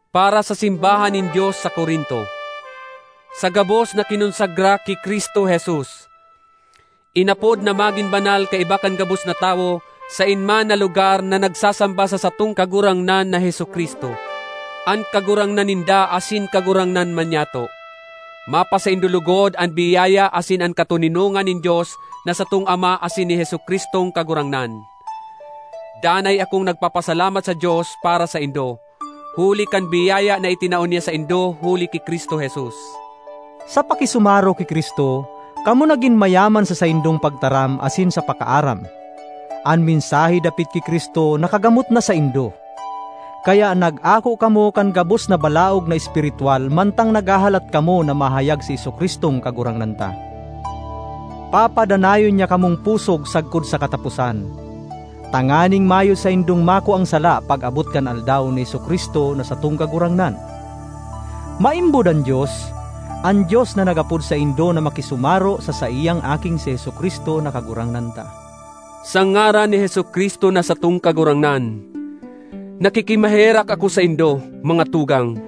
Para sa simbahan nin Dios sa Corinto, sa gabos na kinonsagra ki Cristo Jesus, inapod na magin banal kaiba kan gabos na tawo saen man na lugar na nagsasamba sa satong Kagurangnan na Jesu-Cristo, an Kagurangnan ninda asin Kagurangnan man nyato: Mapasaindo logod an biyaya asin an katoninongan nin Dios na satong Ama asin ni Jesu-Cristong Kagurangnan. Danay akong nagpapasalamat sa Dios para saindo, huli kan biyaya na itinao niya saindo huli ki Cristo Jesus. Sa pakisumaro ki Cristo, kamo nagin mayaman sa saindong pagtaram asin sa pakaaram. An mensahe dapit ki Cristo nakagamot na saindo. Kaya nag-ako kamo kan gabos na balaog na espiritwal, mantang naghahalat kamo na mahayag si Jesu-Cristong Kagurangnan ta. Papadanayon niya kamong pusog sagkod sa kataposan, tanganing mayo saindong makuang sala pag-abot kan Aldaw ni Jesu-Cristo na satong Kagurangnan. Maimbod an Dios—an Dios na nag-apod saindo na makisumaro sa saiyang Aking si Jesu-Cristo na Kagurangnan ta. Sa ngaran ni Jesu-Cristo na satong Kagurangnan, nakikimaherak ako saindo, mga tugang,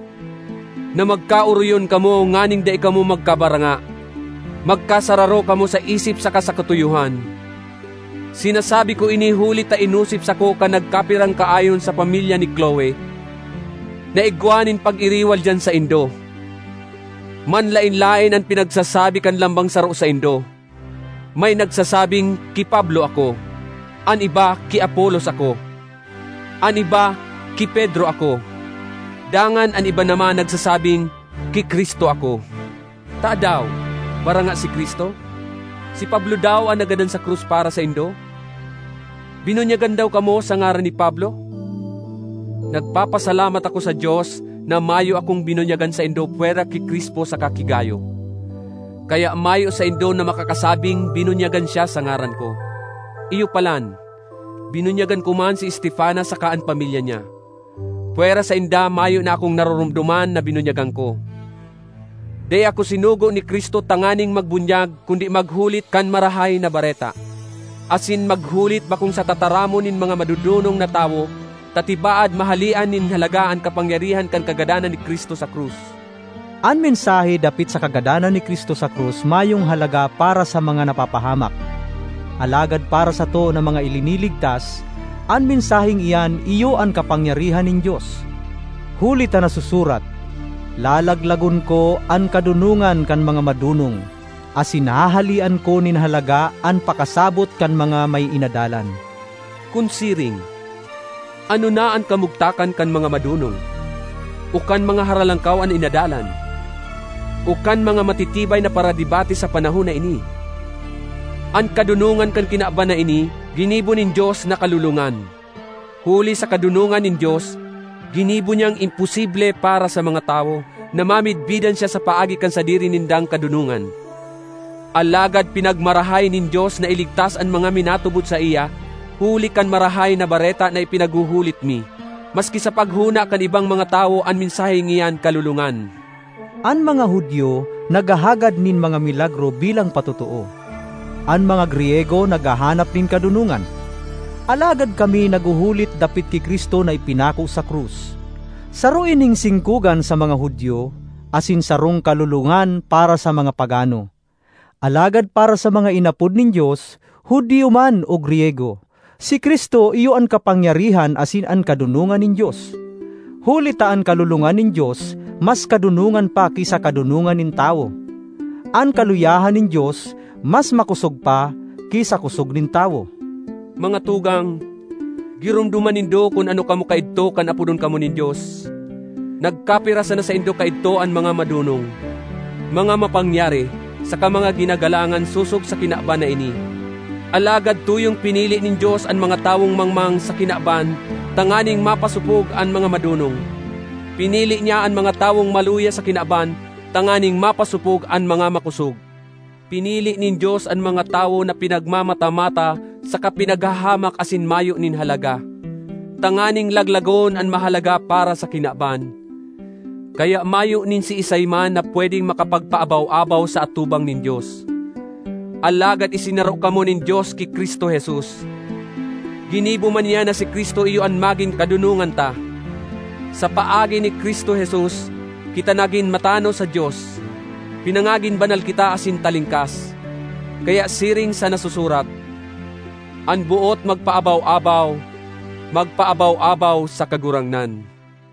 na magkaoroyon kamo nganing dai kamo magkabaranga; magkasararo kamo sa isip saka sa katuyohan. Sinasabi ko ini huli ta inosip sako kan nagkapirang kaayon sa pamilya ni Cloe, na igwa nin pag-iriwal diyan saindo. Manlaen-laen an pinagsasabi kan lambang saro saindo. May nagsasabing, “Ki Pablo ako”; an iba, “Ki Apolos ako”; an iba, “Ki Pedro ako”; dangan an iba naman nagsasabing, “Ki Cristo ako.” Tadaw, baranga si Cristo? Si Pablo daw an nagadan sa krus para saindo? Binunyagan daw kamo sa ngaran ni Pablo? Nagpapasalamat ako sa Dios na mayo akong binunyagan saindo pwera ki Crispo saka ki Gayo. Kaya mayo saindo na makakasabing binunyagan siya sa ngaran ko. (Iyo palan, binunyagan ko man si Estefanas saka an pamilya niya. Pwera sainda mayo na akong naroromdoman na binunyagan ko.) Dai ako sinugo ni Cristo tanganing magbunyag kundi maghulit kan Marahay na Bareta, asin maghulit bakong sa tataramon nin mga madodonong na tawo, ta tibaad mahalean nin halaga an kapangyarihan kan kagadanan ni Cristo sa krus. An mensahe dapit sa kagadanan ni Cristo sa krus mayong halaga para sa mga napapahamak; alagad para sato na mga iliniligtas, an mensaheng iyan iyo an kapangyarihan nin Dios. Huli ta nasusurat, “Lalaglagon ko an kadonongan kan mga madonong, asin hahalean ko nin halaga an pakasabot kan mga may inadalan.” Kun siring, ano na an kamugtakan kan mga madonong? o kan mga haralangkaw an inadalan? o kan mga matitibay na paradebate sa panahon na ini? An kadonongan kan kinaban na ini, ginibo nin Dios na kalolongan! Huli sa kadonongan nin Dios, ginibo niyang imposible para sa mga tawo na mamidbidan siya sa paagi kan sadiri nindang kadonongan. Alagad pinagmarahay nin Dios na iligtas an mga minatubod saiya huli kan Marahay na Bareta na ipinaghuhulit mi, maski sa paghona kan ibang mga tawo an mensaheng iyan kalolongan. An mga Judio naghahagad nin mga milagro bilang patotoo; an mga Griyego naghahanap nin kadonongan. Alagad kami naghuhulit dapit ki Cristo na ipinako sa krus. Saro ining singkogan sa mga Judio, asin sarong kalolongan para sa mga pagano. Alagad para sa mga inapod nin Dios, Judio man o Griyego, si Cristo iyo an kapangyarihan asin an kadonongan nin Dios. Huli ta an kalolongan nin Dios, mas kadonongan pa ki sa kadonongan nin tawo; an kaluyahan nin Dios, mas makosog pa ki sa kosog nin tawo. Mga tugang, giromdoma nindo kun ano kamo kaidto kan apodon kamo nin Dios. Nagkapira sana saindo kaidto an mga madonong, mga mapangyari, saka mga ginagalangan, sosog sa kinaban na ini. Alagad tuyong pinili nin Dios an mga tawong mangmang sa kinaban tanganing mapasopog an mga madonong. Pinili niya an mga tawong maluya sa kinaban tanganing mapasopog an mga makosog. Pinili nin Dios an mga tawo na pinagmamata-mata saka pinaghahamak asin mayo nin halaga, tanganing laglagon an mahalaga para sa kinaban. Kaya mayo nin siisay man na pwedeng makapagpaabaw-abaw sa atubang nin Dios. Alagad isinaro kamo nin Dios ki Cristo Jesus; ginibo man niya na si Cristo iyo an magin kadonongan ta. Sa paagi ni Cristo Jesus, kita nagin matanos sa Dios; pinangagin banal kita asin talingkas. Kaya siring sa nasusurat, “An boot magpaabaw-abaw, magpaabaw-abaw sa Kagurangnan.”